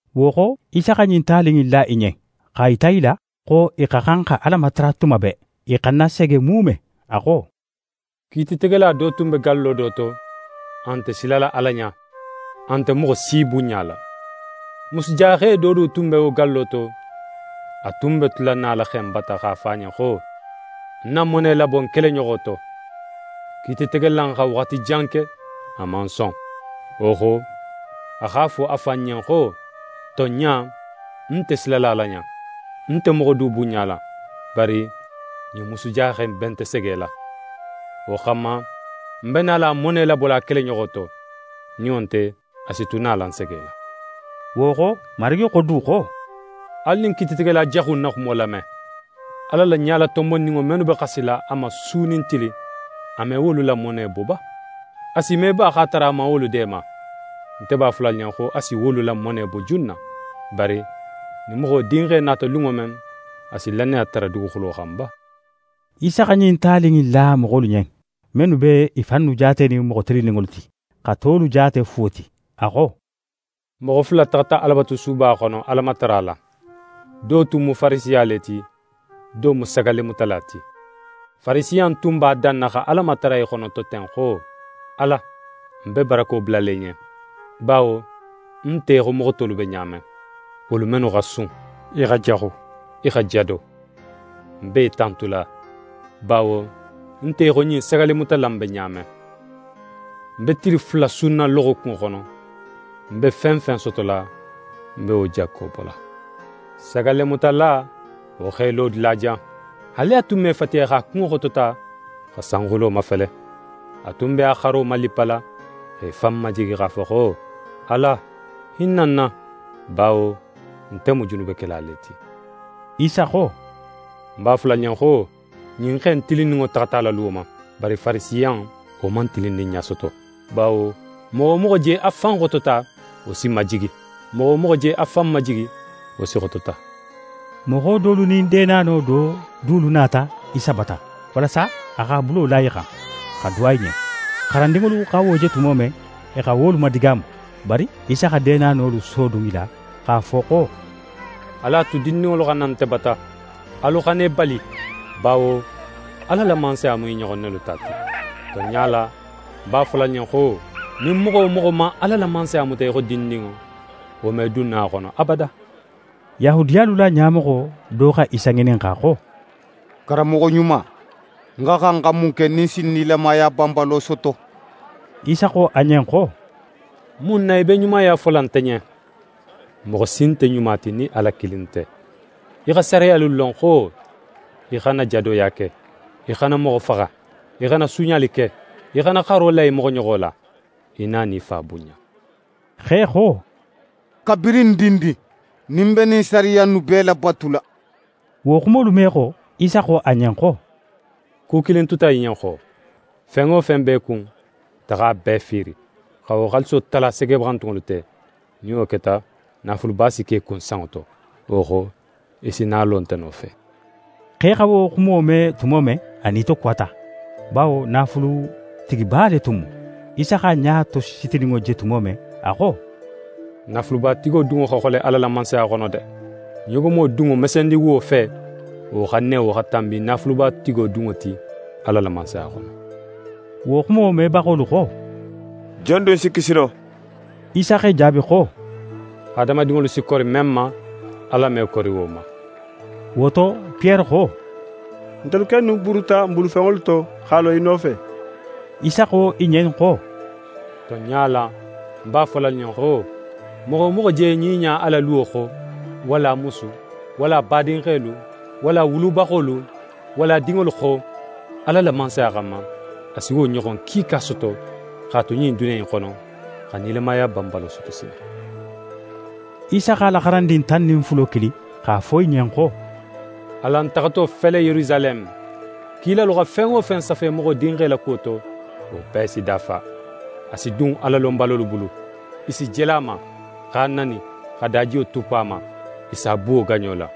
Wo xo, Isa xa ɲin tali in la i ɲen, x'a yita i la xo i xa xan xa Ala matara tuma bee, i xana sege muume. A xo: «Kiititegela do tun be gallo do to, a nte silala Ala ɲa, a nte moxo si bunɲala. Musujaxe do du tun be wo gallo to, a tun be tula nala xe in bata x'a fo a ɲen xo: “Ń na mone labo ń keleɲoxo to!” Kiititegela in xa waxati jan ke, a man son. Wo xo, a x'a fo a fan ɲen xo: “Tonɲa, ń nte silala Ala ɲa, ń nte moxo du bunɲala. Bari ɲin musujaxe in be nte segela. Wo xanma, ń be nala a mone labola a keleɲoxo to. Nin wo nte, a si tu nala ń segela.”» Wo xo, Marigi xo du xo: «Alu ɲin kiititegela jaxu in na xumo lame! Ala la ɲalatonbonninŋo mennu be xasila a ma su nin tili, a me wolu la mone bo ba? A si me ba x'a tara a man wolu deema? Nte b'a fola alu ɲen xo a si wolu la mone bo junna. Bari nin Moxo Dinxe nata lunŋo men, a si lannaya tara duguxulo xan ba?» Isa xa ɲin tali in la moxolu ɲen, mennu be i fannu jaatenin moxo tilinninŋolu ti, xa tolu jaate fuwo ti, a xo: «Moxo fula taxata Alabatusuba xono Ala matara la. Do tun mu Farisiya le ti, do mu sagallemutala ti. Farisiya in tun b'a danna xa Ala matara í xonoto ten xo: “Ala, ń be barako bulala í ɲen, bawo ń nte í xo moxo tolu be ɲa men, wolu mennu xa sun, i xa jaxu, i xa jado; ń b'é tantula, bawo ń nte í xo ɲin sagallemutala in be ɲa men. Ń be tili fula sunna loxokunŋo xono. Ń be fen fen sotola, ń be wo jakko bola.” Sagallemutala, wo x'é lo dulajan, haali a tun me fatiya, x'a kunŋo xotota xa sanxulo mafele. A tun be a xaro malippala x'é fan majigi x'a fo xo: “Ala, hinna ń na, bawo nte mu junubekela le ti.”» Isa xo: «Ń b'a fola alu ɲen xo, ɲin xe in tilinninŋo taxata a la luwo ma, bari Farisiya in, wo man tilinninɲa soto. Bawo moxo wo moxo je a fan xotota, wo si majigi. Moxo wo moxo je a fan majigi, wo si xotota.» Moxo dolu nin deenano do dulu nata Isa bata, walasa a x'a bulo la i xan, xa duwa i ɲen. xarandinŋolu xa wo je tumo men, i xa wolu madigaamu. Bari Isa xa deenanolu sodun í la, x'a fo xo: «Alu a tu dindinŋolu xa na nte bata! Alu xana i bali, bawo Ala la Mansaya mu i ɲoxon nelu ta ti. Tonɲa la, ń b'a fola alu ɲen xo: Nin moxo wo moxo man Ala la Mansaya muta í xo dindinŋo, wo me dun no a xono abada.» Yahudiyalu la ɲamoxo do xa Isa ŋininxa xo: «Karanmoxo ɲuma, ń xa xan xa mun ke nin ń si nilamaya banbalo soto?» Isa xo a ɲen xo: «Mun na í be ɲumaya fola nte ɲen? Moxo si nte ɲuma ti nin Ala kilin nte. Í xa sariyalu lon xo: “Í xana jadoya ke; í xana moxo faxa; í xana suuɲali ke; í xana xaro la í moxoɲoxo la; í na nin í fa bunɲa.”» Xe xo: «Kabirin ń dindin, nin ń be ɲin sariya innu bee labatula.» Wo xumolu me xo, Isa xo a ɲen xo: «Ku kilin tuta í ɲen xo. Fen wo fen be í kun, taxa a bee fiiri, xa wo xaaliso tala segebaxantunŋolu te. Nin wo keta, naafuluba si ke í kun sanŋo to. Wo xo, í si na a lo nte nofe.» Xe xa wo xumo me tumo men, a nitokuwata, bawo naafulutigiba le tun mu. Isa x'a ɲa tositininŋo je tumo men, a xo: «Naafulubatigo dunŋo xa xole Ala la Mansaya xono de! Ɲogomo dunŋo mesendiwuwo fe, wo xa newo xa tanbi naafulubatigo dunŋo ti Ala la Mansaya xono.» Wo xumo mebaxolu xo: «Jon dun si kisi no?» Isa x'e jaabi xo: «Hadamadinŋolu si kori men ma, Ala me kori wo ma.» Wo to, Piyere xo: «Ntelu kennu buruta n bulufenŋolu to, x'a lo í nofe.» Isa xo i ɲen xo: «Tonɲa la, ń b'a fola alu ɲen xo: Moxo wo moxo je ɲiɲa a la luwo xo, walla a musu, walla a badinxelu, walla a wulubaxolu, walla a dinŋolu xo, Ala la Mansaya xanma, a si wo ɲoxon kiika soto x'a tu ɲin duniya in xono, xa nilamaya banbalo soto sinin.» Isa x'a la xarandin tan nin fulo kili, x'a fo i ɲen xo: «Alan taxato fele Yerusaleme, kilalu xa fen wo fen safe Moxo Dinxe la kuwo to, wo bee si dafa. A si dun Alalonbalolu bulu, i si jele a ma, x'a nani, xa dajiyo tuppu a ma. I s'a buwo gaɲo la.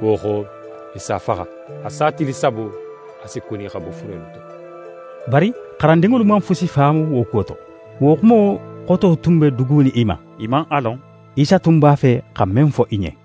Wo xo, i s'a faxa. A sa tili sabo, a si kuni xa bo furelu to.» Bari xarandinŋolu man fusi faamu wo kuwo to. Wo xumo xoto tun be dugunin i ma. I man a lon Isa tun b'a fe xa men fo i ɲen.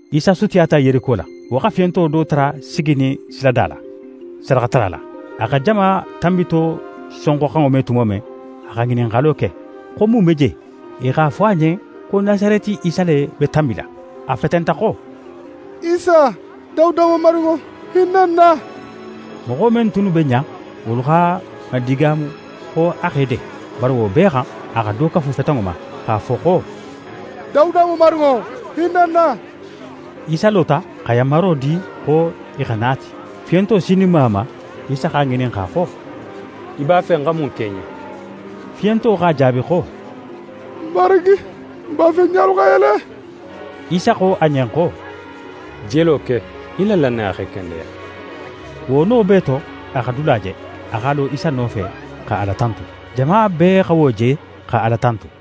Isa sutiyata Yeriko la. Wo xa fiyonto do tara siginin silada la, sadaxatara la. A xa jama tanbito sonxoxanŋo me tumo men, a xa ŋininxalo ke, xo mun be je. I x'a fo a ɲen xo Nasareti Isa le be tanbila. A fetenta xo: «Isa, Dawuda Mamarinŋo, hinna ń na!» Moxo men tunnu be ɲa, wolu x'a madigaamu xo a x'é de. Bari wo bee xan, a xa do kafu fetenŋo ma, x'a fo xo: «Dawuda Mamarinŋo, hinna ń na!» Isa lota, xa yanmaro di xo i xa na a ti. Fiyonto sininma a ma, Isa x'a ŋininxa xo: «Í b'a fe ń xa mun ke í ɲen?» Fiyonto x'a jaabi xo: «Marigi, ń b'a fe ń ɲalu xa yele!» Isa xo a ɲen xo: «Jelo ke! Í la lannaya x'é kendeya.» Wo no bee to, a xa dula je. A x'a lo Isa nofe, xa Ala tantu. Jama bee xa wo je, xa Ala tantu.